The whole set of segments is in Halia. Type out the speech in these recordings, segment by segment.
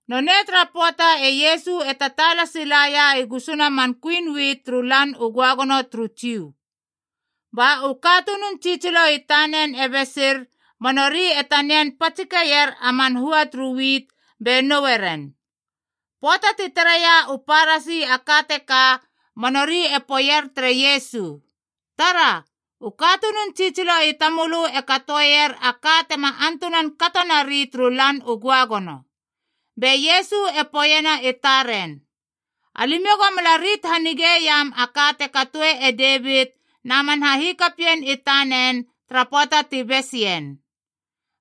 Nonei tara pöata e Iesu e tataala silaia i gusuna man kuin wit turu Lan u Göagono turu Jiu. Ba u katunun tsitsilo i tanen e besir ba nori e tanian patsikeier a man hua turu wit be noue ren. Pöata ti tareia u Parasi a ka teka ba nori e poeier tere Iesu, “Tara, u katunun tsitsilo i tamölö e katoeier a ka tema antunan kato nari turu Lan u Göagono.” Be Iesu e poeiena i taren, “Alimiou go mala rit hanigeiam a ka te katoe e Devit na man hahikapien i tanen tara pöata ti bes ien.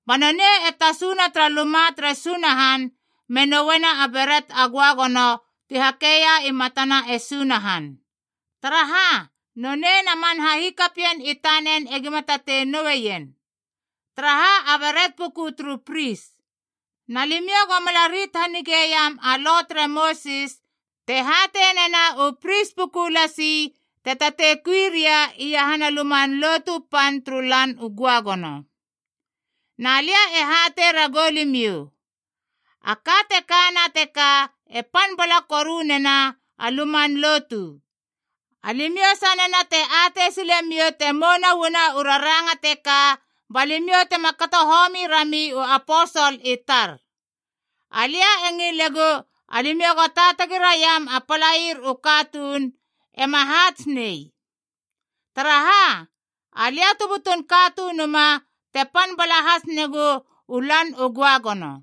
Ba nonei e tasuna tara luma tere Sunahan me nouena a beret a göagono ti hakeia i matana e Sunahan. Taraha, nonei na man hahikapien i tanen egima tatei noueien. Taraha, a beret puku turu pris. Na limiou go mala rit hanigeiam a Lo tere Mosis te hatei nena u pris puku lasi te tatei kui ria iahana Luman Lotu Pan turu Lan u Göagono. Na lia e hatei ragou limiou, a ka te kana teka e pan bala koru nena a Luman Lotu. Alimiou sanena te atei silemiou te mouna uana u raranga teka, ba limiou tema kato homi rami u aposol i tar. Alia e ngilegu, alimiou go taatagi raiam a palair u katuun, ema haats nei. Taraha, Alia tu butun Katunuma te pan bala has negu u Lan u Göagono.”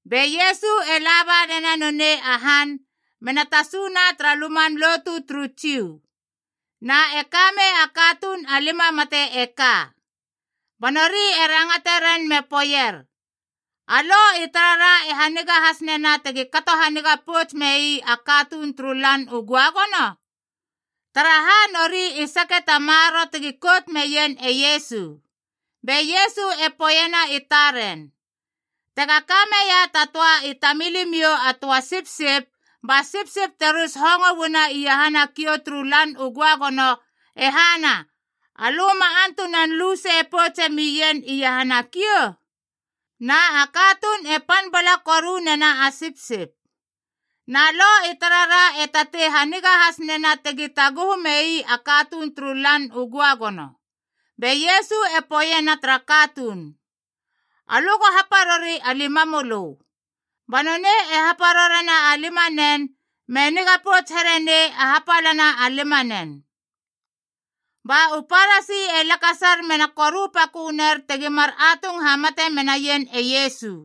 Be Iesu e la banena nonei a han mena tasuna tara luman lotu turu Jiu. Na e kamei a katuun a lima mate e ka. Ba nori e rangate ren me poeier, “A Lo i tarara e haniga has nena tegi kato haniga pouts mei a katuun turu Lan u Göagono?” Taraha, nori i sake ta maroro tegi kout meien e Iesu. Be Iesu e poeiena i taren, “Tega ka meia ta töa i tamilimiou a töa sipsip, ba sipsip te rus hongo uana iahana kiou turu Lan u Göagono, e hana, alö ma antunan lusei poutse meien iahana a kiou? Na a katuun e pan bala koru nena a sipsip. Na Lo i tarara e tatei haniga has nena tegi taguhu mei a katuun turu Lan u Göagono.” Be Iesu e poeiena tara katuun, “Alö go haparori a limamölö.” Ba nonei e haparorena a limanen, me niga pouts here nei a hapalana a limanen. Ba u Parasi e lakasar mena korupakö ner tegi mar atung hamate menaien e Iesu.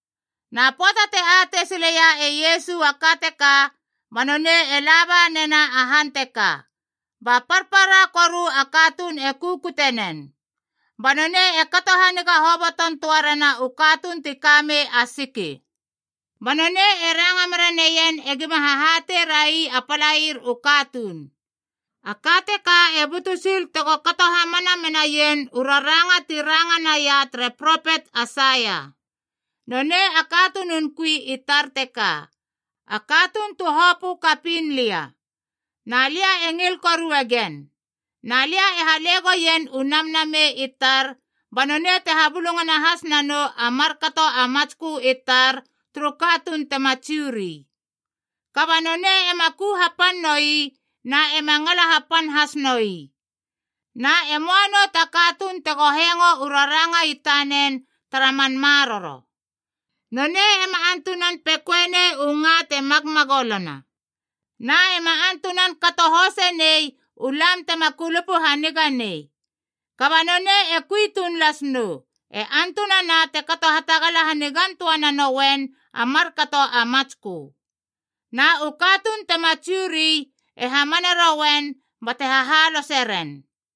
Na pöata te atei sileia e Iesu a ka teka, ba nonei e la ba nena a han teka, ba parpara koru a katuun e kukute nen. Ba nonei e kato haniga hoboton töa rena u katuun ti kamei a siki. Ba nonei e ranga mera neien e gima hahatei rai a palaier u katuun. A ka teka e butu sil tego kato hamana menaien u raranga ti ranga naia tere propet Aisaia. “Nonei a katunun kui i tar teka, a katuun tu hopö kapiin lia. Na lia e ngil koruegen. Na lia e hale goien u Namnamei i tar, ba nonei te habulungana has nanou a markato a matskö i tar turu katuun tema Jiu ri. Kaba nonei ema ku hapan noi na ema ngala hapan has noi. Na e möa nou ta katuun tego hengo u raranga i tanen tara man maroro. Nonei ema antunan pekoe nei u nga te magmagolona, na ema antunan kato hoseinei u lam tema kulupu haniga nei. Kaba nonei e kui tuun las nou, e antunana te kato hatagala hanigan töa nanouen a markato a matskö. Na u katuun tema Jiu ri e hamane roen bate hahalose ren.”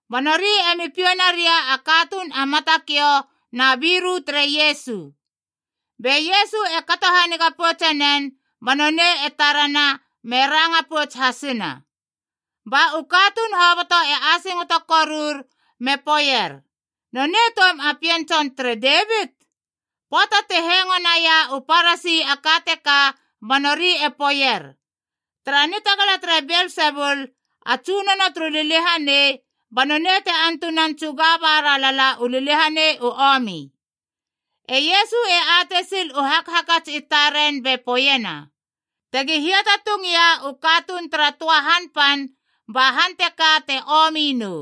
Ba nori emi piou naria a katuun a matakiou na biru tere Iesu. Be Iesu e kato haniga poutse nen, ba nonei e tarana me ranga pouts hasina. Ba u katuun hoboto e asingoto korur me poeier, “Nonei toum a pien tson tere Devit?” Pöata ti hengo naia u Parasi a ka teka ba nori e poeier, “Tara nitagala tere Belsebul, a tsunono turu liliahanei, ba nonei te antunan tsuga bara lala u liliahanei u omi.” E Iesu e atei sil u hakhakats i taren be poeiena, “Tegi hiatatungia u katuun tara töa han pan, ba han teka te omi nou.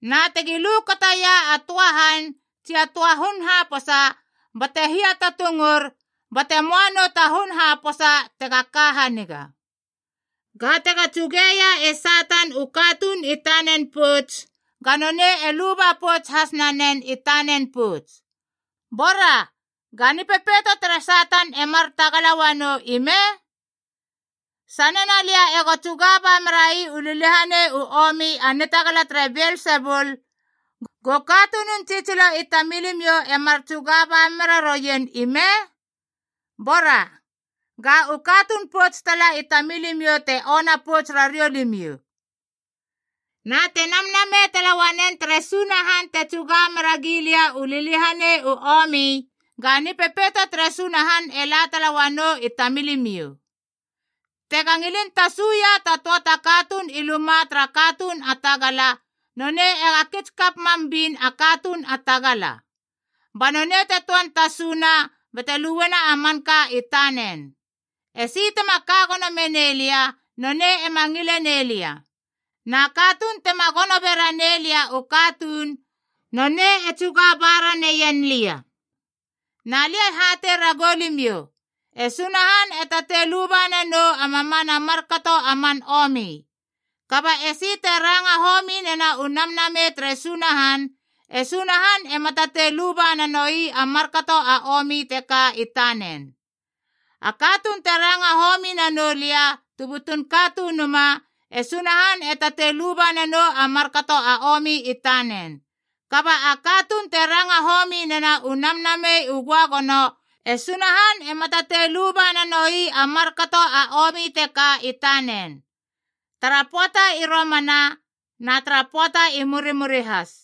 Na tegi lukataia a töa han tsi a töa hun haposa, bate hiatatungur bate möa nou ta hun haposa tega ka haniga. Ga tega tsugeia e Satan u katuun i tanen pouts, ga nonei e luba pouts has nanen i tanen pouts. Bora, ga nipepeito tere Satan e mar tagala uanou ime? Sanena lia ego tsuga ba merai u liliahanei u omi a nitagala tere Belsebul, go katunun tsitsilo i tamilimiou e mar tsuga ba mera rouien ime? Bora, ga u katuun pouts tala i tamilimiou te ona pouts rariou limiou. Na te Namnamei tala uanen tere Sunahan te tsuga mera gilia u liliahanei u omi, ga Nipepeito tere Sunahan e la tala uanou i tamilimiou. “Tega ngilin tasuia ta töa ta katuun i luma tara katuun a tagala, nonei ega kits kap mam bin a katuun a tagala. Ba nonei te töan tasuna bate luena a manka i tanen. Esi tema ka gono menei lia, nonei ema ngile nei lia. Na katuun tema gono bera nei lia u katuun, nonei e tsuga ba raneien lia. Na lia e hatei ragou limiou, e Sunahan e tatei luba nanou a mamana markato a man omi. Kaba esi te ranga homi nena u Namnamei tere Sunahan, e Sunahan ema tatei luba nanoi a markato a omi teka i tanen. A katuun te ranga homi nanou lia tu butun Katunuma, e Sunahan e tatei luba nanou a markato a omi i tanen. Kaba a katuun te ranga homi nena u Namnamei u Göagono, e Sunahan ema tatei luba nanoi a markato a omi teka i tanen, tara pöata i romana, na tara pöata i murimuri has.”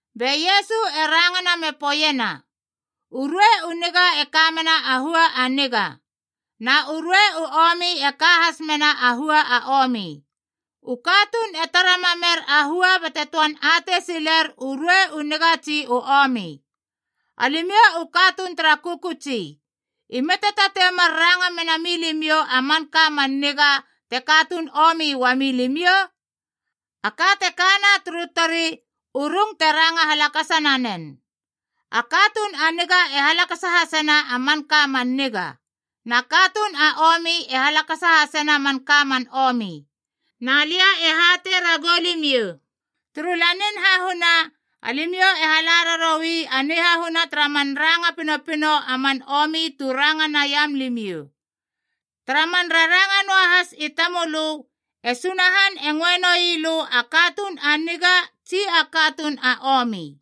Be Iesu e rangana me poeiena, “U ruei u niga e ka mena a hua a niga. Na u ruei u omi e ka has mena a hua a omi. U katuun e tara mamer a hua bate töan atei siler u ruei u niga tsi u omi. Alimiou u katuun tara kökötsi. Ime te tatei mar ranga mena milimiou a manka man niga te katuun omi uamilimiou? A ka te kana turu tori, u rung te ranga halakasa nanen. A katuun a niga e halakasena a manka man niga, na katuun a omi e halakasa hasena a manka man omi. “Na lia e hatei ragou limiou, turu Lanin Hahuna alimiou e hala raroui a nihahuna tara man ranga pinopino a man omi tu ranga naiam limiou. Tara man raranga noahas i tamölö e Sunahan e ngöe noi lö a katuun a niga tsi a katuun a omi.”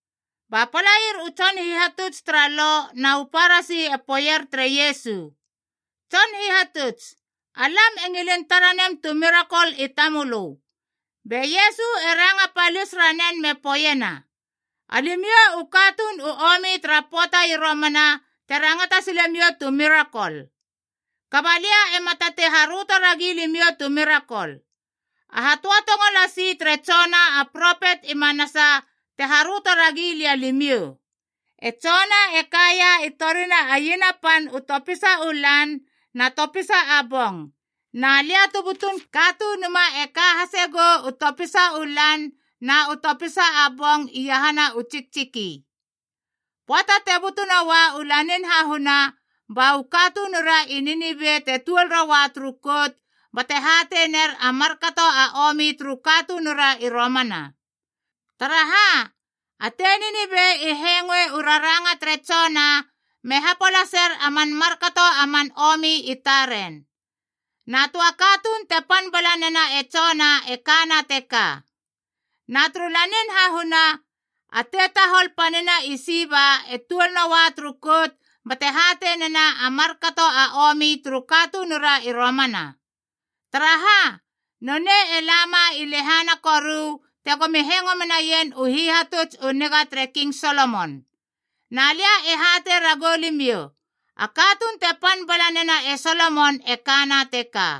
Ba palair u tson hihatuts tara Lo na u Parasi e poeier tere Iesu, “Tson Hihatuts, alam e ngilin tara nem tu mirakol i tamölö.” Be Iesu e ranga palis ranen me poeiena, “Alimiou u katuun u omi tara pöata i romana te rangata silemiou tu mirakol. Kaba alia ema tatei haröto ragi limiou tu mirakol. A hatöatongo lasi tere Jona a propet i manasa te haröto ragi lia limiou. E Jona e kaia i torina a iena pan u topisa u lan na topisa a bong, na Alia tu butun Katunuma e ka hasegou u topisa u lan na u topisa a bong iahana u tsiktsiki. Pöata te butu noa u lanin hahuna, ba u katunura i Ninive te tuol roa turu kout bate hatei ner a markato a omi turu katunura i romana. Taraha, a tei Ninive i hengoe u raranga tere Jona me hapolaser a man markato a man omi i taren. Na töa katuun te pan bala nena e Jona e kana teka. Na turu lanin hahuna, a tetahol panina i Siba e tuol noa turu kout bate hatei nena a markato a omi turu katunura i romana. Taraha, nonei e lama i lehana koru tegomi hengo menaien u hihatuts u niga tere King Solomon. Na lia e hatei ragou limiou, a katuun te pan bala nena e Solomon e kana teka.”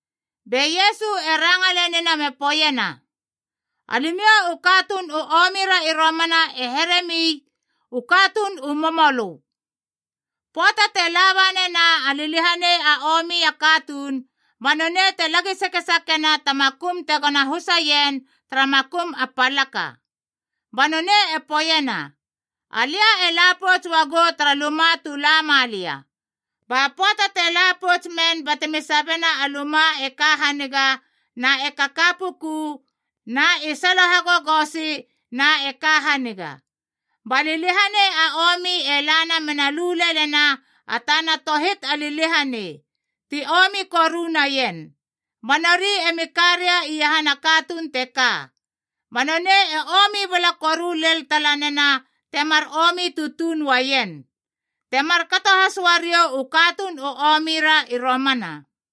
Be Iesu e ranga lenina me poeiena, “Alimiou u katuun u omi ra i romana e heremi u katuun u momolö. Pöata te la ba nena a liliahanei a omi a katuun, ba nonei te lagi sakesakiena ta makum tegona husa ien tara makum a palaka. Ba nonei e poeiena, ‘Alia e la pouts uagou tara luma tu la ma lia.’ Ba pöata te la pouts men batemi sabiena a luma e ka haniga, na e kaka pukuna, na i salo hagogosi na e ka haniga. Ba liliahanei a omi e lana mena lu lelena a tana tohit a liliahanei, ti omi koru naien. Ba nori emi karia iahana katuun teka. Ba nonei e omi bala koru lel tala nena temar omi tutuun uaien. Te markato has uariou u katuun u omi ra i romana.”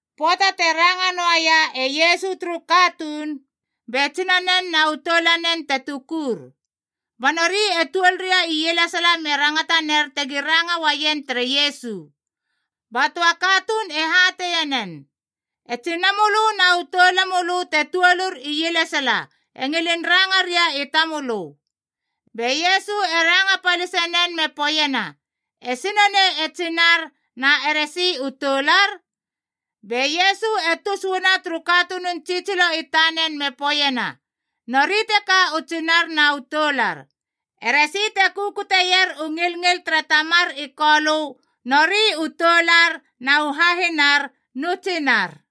Pöata te ranga noaia e Iesu turu katuun, be tsinanen na u toulanen te tukur. Ba nori e tuol ria ielesala me rangata ner tegi ranga uaien tere Iesu. Ba töa katuun e hatei nen, “E tsinamölö na u toulamölö te tuolur ielesala e ngilin ranga ria i tamölö.” Be Iesu e ranga palise nen me poeiena, “Esi nonei e tsinar na eresi u toular?” Be Iesu e tus uana turu katunun tsitsilo i tanen me poeiena, “Nori teka u tsinar na u toular. Eresi te kukutieier u ngilngil tere Tamar i Kolö nori u toular na u hahinar nu tsinar.”